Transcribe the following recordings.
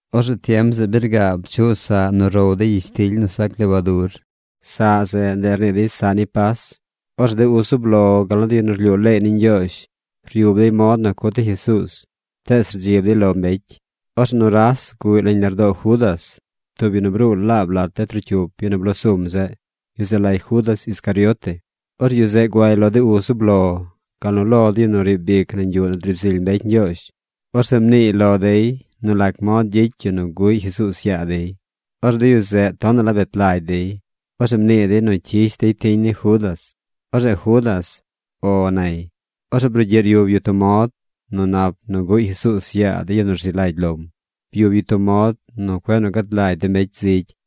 Orzeꞌ tiem zeꞌ bi rgaab chuꞌ saꞌ nu gow dey gyishtily nu sac lebadur. Saꞌ zeꞌ, ndeꞌ rnii dey saꞌ ni Pas. Orzeꞌ de uz zub lo, gal nu de yu nu rlyuu leey ni Ñgyoozh ryub dey mod nu cut dey Jesuuz, tees rdzib dey lo mbecy. Orzeꞌ nuras guꞌy nañ lardoo Judas, tub yu nu bruu laab lat de trocyup yu nu bloo sum zeꞌ. Yu zeꞌ lay Judas Iscariote. Orzeꞌ yu zeꞌ guay lo de uz zub lo, gal nu lo de yu nu riib ic nañ yuꞌ nu driib zily mbecy Ñgyoozh. Orzeꞌ mniiy lo dey nu lac mod gyicy yu nu guꞌy Jesuuz yaa dey. Orzeꞌ de yu zeꞌ tonaꞌ la bet lagy dey. Orzeꞌ mnii dey nu cyish dey tiñ ni Judas. Orzeꞌ Judas “O” nay. Orzeꞌ brugyiꞌ ryub yu tub mod nu nap nu guꞌy Jesuuz yaa de yu nu rzi lagy lom. Byub yu tub mod nu cueꞌ nu gad lagy de mbecy zigy.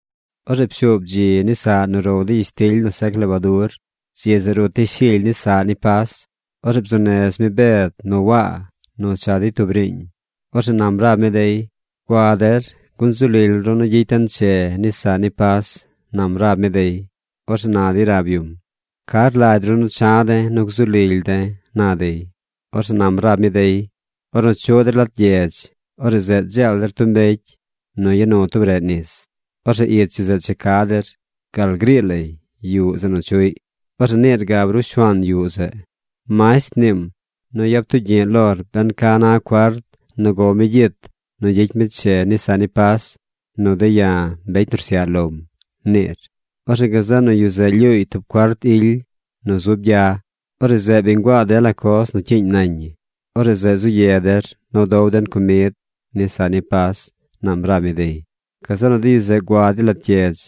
Orzeꞌ pshuub dzi ni saꞌ nu row dey gyishtily nu sac lebadur. Dzi zeꞌ rut dey shily ni saꞌ ni Pas. Orzeꞌ bzuu nez mi Bed nu Waa nu cha dey tub riiñ. Orzeꞌ nam rab mi dey: ―Gua der gun zu lily ru nu gyicy den che ni saꞌ ni Pas ―nam rab mi dey. Orzeꞌ na dey rab yum: ―¿Ca rlagy ru nu cha̱ de̱ nu gzu lily de̱? ―na dey. Orzeꞌ nam rab mi dey: ―Ornu chuꞌ der lat gyedz, orzeꞌ zeꞌ dzeel der tub mbecy nu ya nu tub reꞌ nis. Orzeꞌ ich yu zeꞌ cha ca der gal grii lay yuꞌ zeꞌ nu chuꞌy. Orzeꞌ niir gab ru shuaan yuꞌ zeꞌ: “Masht mniim nu yap tugyi̱ꞌ lor ben ca na cuart nu gow mi gyit nu gyicy mi che ni saꞌ ni Pas nu de̱ ya̱, mbecy nu rsyaꞌ lom”, niir. Orzeꞌ gazeꞌ nu yu zeꞌ lyuuy tub cuart ily nu zub gya. Orzeꞌ zeꞌ bi nguaa dela coz nu cyiiñ nañ ñi. Orzeꞌ zeꞌ zu ye der nu dow den comid ni saꞌ ni Pas ―nam rab mi dey. Gazeꞌ nu de yu zeꞌ gua dey lat gyedz.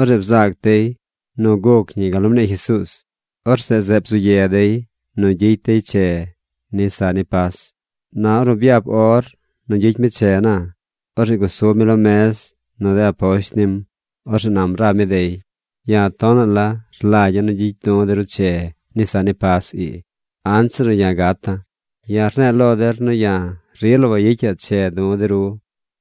Orzeꞌ bzaac dey nu guc ñi gal nu mnii Jesuuz. Orzeꞌ zeꞌ bzu ye dey nu gyicy dey che ni saꞌ ni Pas. Na ornu byap or nu gyicy mi che na, orzeꞌ gusub mi lo mez nu de aposht nim. Orzeꞌ nam rab mi dey: ―¡Ya̱ tonaꞌ la rlagya̱ nu gyicy du̱ de ru che ni saꞌ ni Pas ii anzir nu ya̱ gata̱! Ya̱ rne̱e̱ lo der nu ya̱ rila wayicaꞌ che du̱ de ru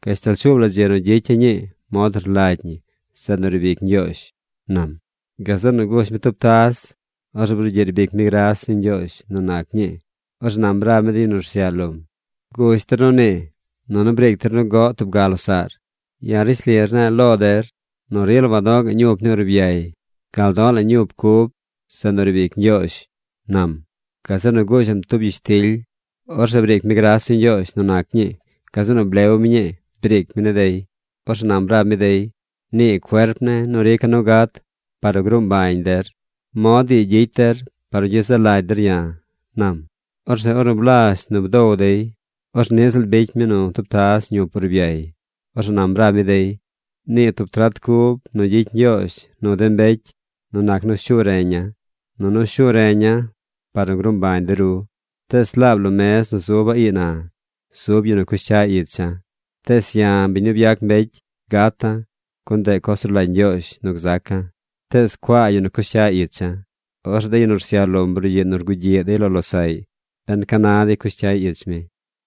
gashtal shuub la dzi nu gyicya̱ ñii mod nu rlagy ñi zeꞌ nu riib ic Ñgyoozh ―nam. Gazeꞌ nu gush mi tub taz. Orzeꞌ brugyiꞌ rbic mi gras ni Ñgyoozh nu nac ñii. Orzeꞌ nam rab mi de yu nu rsyaꞌ lom: ―Gush der nu nii, nunu briic der nu goꞌ tub ga losaꞌr. Ya̱ rishli rne̱e̱ lo der nu rila wado̱ꞌ ga̱ꞌ ñup ni urbyay gal do̱ꞌ la̱ ñup cub zeꞌ nu riib ic Ñgyoozh ―nam. Gazeꞌ nu gushaꞌm tub gyishtily. Orzeꞌ briic mi gras ni Ñgyoozh nu nac ñii. Gazeꞌ nu blew mi ñii briic mi ni dey. Orzeꞌ nam rab mi dey: ―Nii cuerp ne̱ nu rica̱ nu gat par nu gruu mbañ der. Mod ii gyicy der par nu gyezaꞌ lagy der ya̱ ―nam. Orzeꞌ ornu blazh nu bdow dey, orzeꞌ niꞌ ziꞌl bicy mi nu tub taz ñup urbyay. Orzeꞌ nam rab mi dey: ―Nii tub trat cub nu gyicy Ñgyoozh nu de mbecy nu nac nu shu reña̱. Nunu shu reña̱ par nu gruu mbañ de ru. Tees laab lo mez nu zuba̱ ii na, zub yu nu cush cya icha̱. Tees ya̱, biñ nu byac mbecy, gata̱, gun ndeꞌ coz nu rlagy Ñgyoozh nu gzaca̱. Tees ¡cuaa yu nu cush cya icha̱! Orzeꞌ de yu nu rsyaꞌ lom brugyiꞌ nu rgugyiꞌ dey lo losaꞌy ben ca na dey cush cyay ich mi.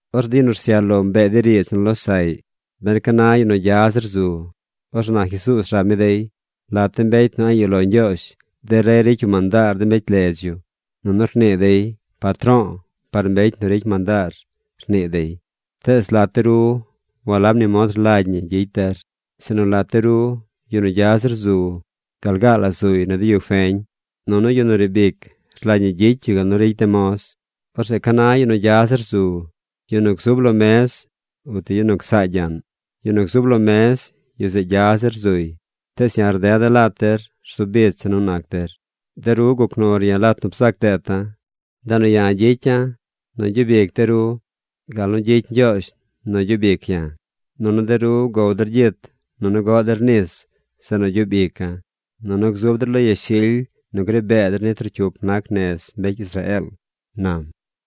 Orzeꞌ de yu nu rsyaꞌ lom bee dey riidz nu losaꞌy ben ca na yu nu gya zir zu. Orzeꞌ na Jesuuz rab mi dey: ―Lat de mbecy nu a̱ꞌ yuꞌ lo Ñgyoozh, de rey ricy yu mandaar de mbecy ledz yu, nunu rnii dey “Patro̱o̱” par mbecy nu ricy mandaar, rnii dey. Tees lat de ru walab ni mod rlagy ñi gyicy der, sinu lat de ru yu nu gya zir zu gal gaa la zuy nu de yu feñ. Nunu yu nu riib ic rlagy ñi gyicy yu gal nu ricy de moz. Orzeꞌ ¿ca na yu nu gya zir zu: yu nu gzub lo mez o ti yu nu csaa gyaꞌn? Yu nu gzub lo mez, yu zeꞌ gya zir zuy. Tees ya̱ rdeda̱ lat der rzu bicha̱ nu nac der. ’De ru guc nur ya̱ lat nu bzac deeta̱. Ndeꞌ nu ya̱ gyicya̱ nu gyub ic de ru gal nu gyicy Ñgyoozh nu gyub ic ya̱. Nunu de ru gow der gyit nunu goꞌ der nis zeꞌ nu gyub ica̱. Nunu gzub der lo yashily nu gri bee der ni trocyup nac nez mbecy Israeel ―nam.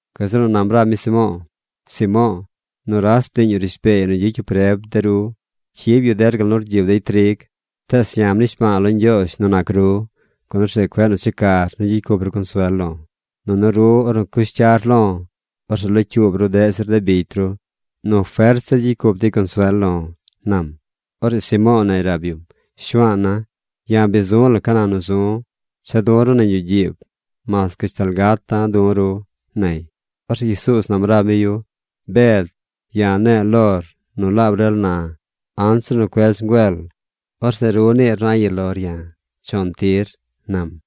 Gazeꞌ nu nam rab mi Simo̱o̱: ―Simo̱o̱, nuras bdiiñ yu rishbeey nu gyicy yu preb de ru. Cyib yu der gal nu rgyib dey trig. Tees ya̱ mnishba̱a̱ lo Ñgyoozh nu nac ru, gun orzeꞌ cueꞌ nu checar nu gyicy cup ru consuel lo̱. Nunu ru ornu cush cyar lo̱, orzeꞌ locyuub ru deꞌ zir de bicy ru nu fert zir gyicy cup dey consuel lo̱ ―nam. Orzeꞌ Simo̱o̱ nay rab yum: ―Shuaana̱, ya̱ bi zu̱ la̱ ca na nu zu̱. Cha̱ du̱ ru nañ yuꞌ gyiib. Mas gashtal gata̱ du̱ ru ―nay. Orzeꞌ Jesuuz nam rab mi yu: ―Bed, ya̱ ne̱e̱ lor nu laab rel na anzir nu cuedz ngüel, orzeꞌ ru niir nu a̱ꞌ yuꞌ lor ya̱ chon tir ―nam.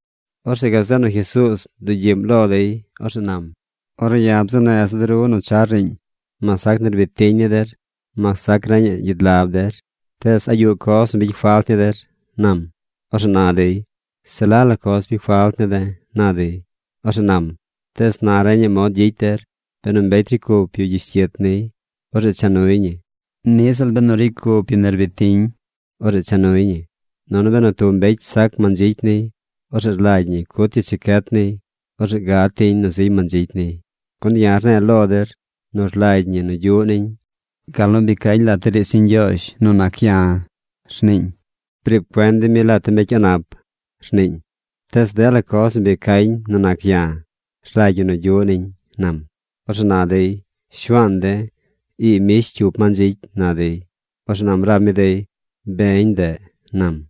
Orzeꞌ gazeꞌ nu Jesuuz bdugyiꞌm lo dey. Orzeꞌ nam: ―Ornu ya̱ bzuu neza̱ de ru nu char riiñ, mas sac gyish gyit ni der, mas sac nerbid tiñ ni der, mas sac reñaꞌ gyid lab der, tees ¿a yuꞌ coz nu bicy falt ni der? ―nam. Orzeꞌ na dey: ―Se la la coz bicy falt ne̱ de̱ ―na dey. Orzeꞌ nam: ―Tees na reñaꞌ mod gyicy der. Benu mbecy ricy cup yu gyish gyit niy, orzeꞌ cha nuy ñi. Niꞌ ziꞌl benu ricy cup yu nerbid tiñ, orzeꞌ cha nuy ñi. Nunu benu tub mbecy sac mandzicy niy, orzeꞌ rlagy ñi cut yu chacyet niy. Orzeꞌ gad tiñ nu ziy mandzicy niy. Gun ya̱ rne̱e̱ lo der nu rlagy ñi nu gyuꞌ niñ gal nu bi cañ lat de riidz ni Ñgyoozh nu nac ya̱. Rniiñ: “Briib cuen dey mi lat de mbecy a̱ꞌ nap”, rniiñ. Tees dela coz nu bi cañ nu nac ya̱ rlagy ñi nu gyuꞌ niñ ―nam. Orzeꞌ na dey: ―Shuaan de̱, ii mbish cyup mandzicy ―na dey. Orzeꞌ nam rab mi dey: ―Beñ ndeꞌ ―nam.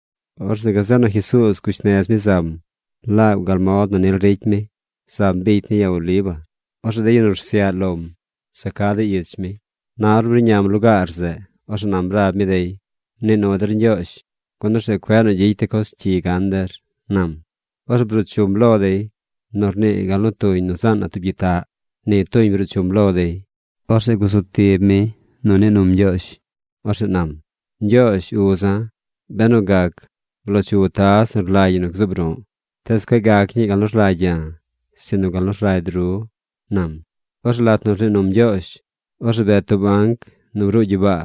Orzeꞌ gazeꞌ nu Jesuuz gush nez mi zam. Laab gal mod nu nil ricy mi, zam bicy ni Ya Oliva. Orzeꞌ de yu nu rsyaꞌ lom za ca dey ich mi. Na ornu bruꞌñam lugaar zeꞌ, orzeꞌ nam rab mi dey: ―Mnii nu der Ñgyoozh, gun orzeꞌ cueꞌ nu gyicy de coz cyi gan der ―nam. Orzeꞌ bruu chum lo dey. Nu rnii gal nu tuñ nu zaan na tub gyitaꞌ ni tuñ bruu chum lo dey. Orzeꞌ gusu tib mi nu mnii num Ñgyoozh. Orzeꞌ nam: ―Ñgyoozh uza̱, benu gac, bloo chu taz nu rlagy ñi nu gzuub ru̱ꞌ. Tees cueꞌ gac ñii gal nu rlagy ya̱, sinu gal nu rlagy ru ―nam. Orzeꞌ lat nu rnii num Ñgyoozh, orzeꞌ bet tub anc nu bruu gyibaa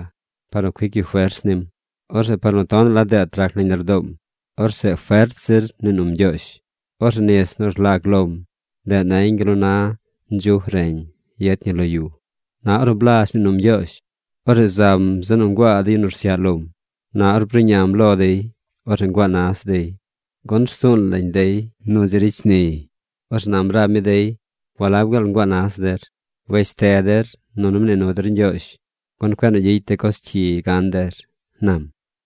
par nu cuic yu fers nim. Orzeꞌ par nu tonaꞌ la deet rac nañ lardoom, orzeꞌ fert zir mnii num Ñgyoozh. Orzeꞌ nis nu rlag lom, ndeꞌ nañ gal nu na ndzuj reñ yet ñi lo yu. Na ornu blazh mnii num Ñgyoozh, orzeꞌ zam zeꞌ nu nguaa de yu nu rsyaꞌ lom. Na ornu bruꞌñam lo dey, orzeꞌ nguaa nas dey, gun rsuun lañ dey nu dzi ricy shni dey. Orzeꞌ nam rab mi dey: ―¿Walab gaal nguaa nas der? Wesh te der nunu mnii nu der Ñgyoozh, gun cueꞌ nu gyicy de coz cyi gan der ―nam.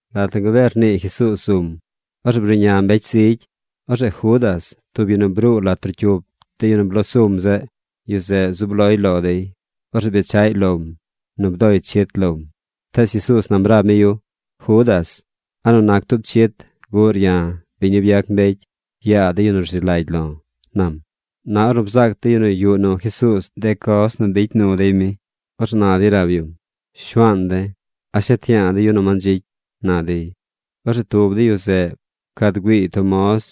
Lat nu gabee rnii Jesuuz zum, orzeꞌ bruꞌña mbecy zigy. Orzeꞌ Judas, tub yu nu bruu lat trocyup de yu nu bloo sum zeꞌ, yu zeꞌ zub loy lo dey. Orzeꞌ bechaꞌy lom nu bdoy chit lom. Tees Jesuuz nam rab mi yu: ―Judas, ¿a nu nac tub chit guꞌr ya̱, biñ nu byac mbecy, yaa de yu nu rzi lagy lo̱? ―nam. Na ornu bzaac de yu nu yuꞌ nu Jesuuz de coz nu bicy nu dey mi, orzeꞌ na dey rab yum: ―Shuaan de̱, ¿a shet yaa de̱ yu nu mandzicy? ―na dey. Orzeꞌ tub de yu zeꞌ pcad güiiy tub moz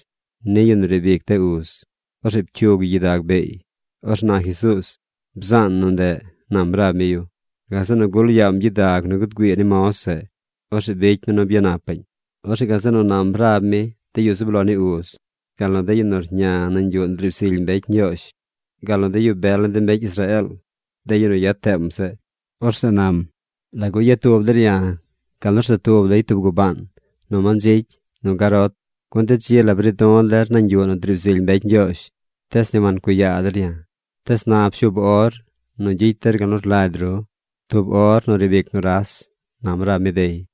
ni yu nu riib ic de uz. Orzeꞌ pcyug yu gyidag beey. Orzeꞌ na Jesuuz: ―Bzaan nu ndeꞌ ―nam rab mi yu. Gazeꞌ nu gul yaam gyidag nu guud güii ni moz zeꞌ. Orzeꞌ bicy mi nu byanapaꞌñ. Orzeꞌ gazeꞌ nu nam rab mi de yu zub lo ni uz, gal nu de yu nu rña nañ yuꞌ nu driib zily mbecy Ñgyoozh, gal nu de yu bel ni de mbecy Israeel, de yu nu yad teem zeꞌ. Orzeꞌ nam: ―¿Lagu yad tub der ya̱ gal nu rza tub dey tub gubaan: nu mandzicy nu garot? Gun de dzi la bri̱ du̱ der nañ yuꞌ nu driib zily mbecy Ñgyoozh. Tees ni wancuꞌ yaa der ya̱. Tees na pshuub or nu gyicy der gal nu rlagy ru, tub or nu riib ic nuras ―nam rab mi dey.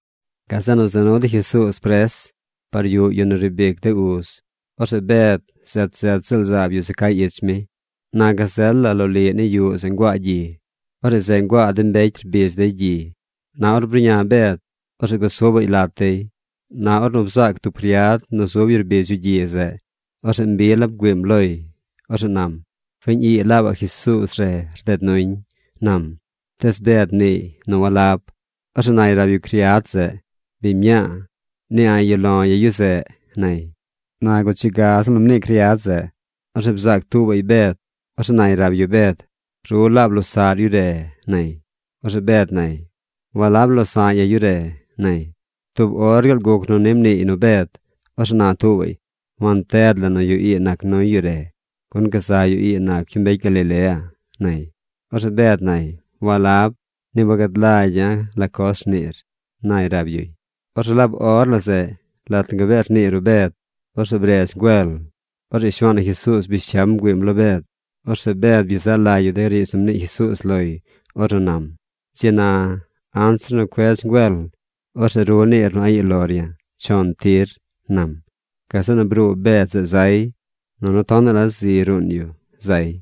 Gazeꞌ nu za nu dey Jesuuz pres par yuꞌ yu nu riib ic de uz. Orzeꞌ Bed zet zet ziꞌl zaab yu za cay ich mi. Na gazel la loliꞌ ni yuꞌ zeꞌ nguaa gyi. Orzeꞌ zeꞌ nguaa de mbecy rbidz dey gyi. Na ornu bruꞌña Bed, orzeꞌ gusubaꞌy lat dey. Na ornu bzaac tub criad nu zub yu rbidz yu gyi zeꞌ, orzeꞌ mbi la bgüiim loy. Orzeꞌ nam: ―Fiñ ii laabaꞌ Jesuuz re rded nuñ ―nam. Tees Bed mniiy nu walab. Orzeꞌ nay rab yu criad zeꞌ: ―Biñ mñaa, ni a̱ꞌ yuꞌ lo̱ ya̱ yu zeꞌ ―nay. Na guchi gaꞌ ziꞌl nu mnii criad zeꞌ, orzeꞌ bzaac tuubaꞌy Bed. Orzeꞌ nay rab yu Bed: ―Ru laab losaꞌr yu re ―nay. Orzeꞌ Bed nay: ―Walab. Walab losa̱ꞌ ya̱ yu re ―nay. Tub or gaal guc nu ni mniiy nu Bed, orzeꞌ na tuubaꞌy: ―Wanted la nu yu ii nac nuy yu re. Gun gazaꞌ yu ii nac yu mbecy Galilea ―nay. Orzeꞌ Bed nay: ―Walab. Ni wagad lagya̱ la coz rniir ―nay rab yuy. Orzeꞌ laab or la zeꞌ, lat nu gabee rnii ruꞌ Bed, orzeꞌ bredz ngüel. Orzeꞌ Shuaan na Jesuuz bish cyam bgüiim lo Bed. Orzeꞌ Bed byezaꞌ lagy yu de riidz nu mnii Jesuuz loy ornu nam: “Dzi na, anzir nu cuedz ngüel, orzeꞌ ru niir nu a̱ꞌ yuur lor ya̱ chon tir”, nam. Gazeꞌ nu bruu Bed zeꞌ zay. Nunu tonaꞌ la zi ruun yu zay.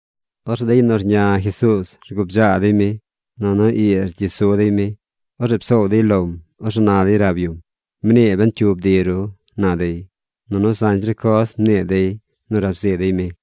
Orzeꞌ de yu nu rña Jesuuz rgubdzaa dey mi, nunu ii rgyi su dey mi. Orzeꞌ psoow dey lom. Orzeꞌ na dey rab yum: ―¡Mnii ben cyu bdi ru! ―na dey. Nunu zañ zir coz mnii dey nu rab zii dey mi.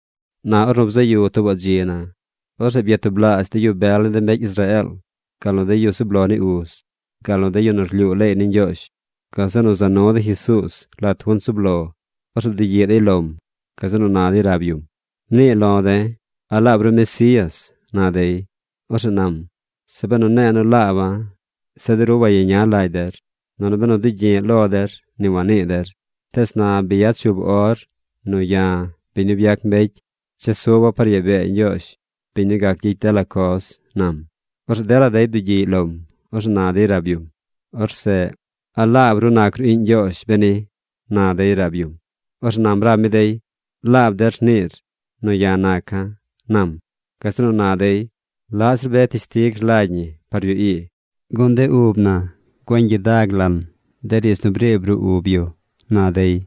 Na ornu bzaꞌ yu tuubaꞌ dzi na, orzeꞌ byatublaazh de yu bel ni de mbecy Israeel, gal nu de yu zub lo ni uz, gal nu de yu nu rlyuu leey ni Ñgyoozh. Gazeꞌ nu za nu dey Jesuuz lat junt zub lo. Orzeꞌ bdugyiꞌ dey lom. Gazeꞌ nu na dey rab yum: ―Mnii lo de̱, ¿a laab ru Mesías? ―na dey. Orzeꞌ nam: ―Zeꞌ benu ne̱e̱ nu laaba̱, zeꞌ de ru wayeña lagy der. Nunu benu dugyi̱ꞌ lo der ni wanii der. Tees na bi yad shuub or nu ya̱, biñ nu byac mbecy, chesuba̱ par yaa bee Ñgyoozh, biñ nu gac gyicy dela coz ―nam. Orzeꞌ dela dey bdugyiꞌy lom. Orzeꞌ na dey rab yum: ―Orzeꞌ ¿a laab ru nac ru iꞌñ Ñgyoozh beni? ―na dey rab yum. Orzeꞌ nam rab mi dey: ―Laab der rniir nu ya̱ naca̱ ―nam. Gazeꞌ nu na dey: ―¿Laꞌ zir be teshtig rlagy ñi par yu ii? Gun de ub na güeñ gyidag lan de riidz nu briib ruꞌ ub yu ―na dey.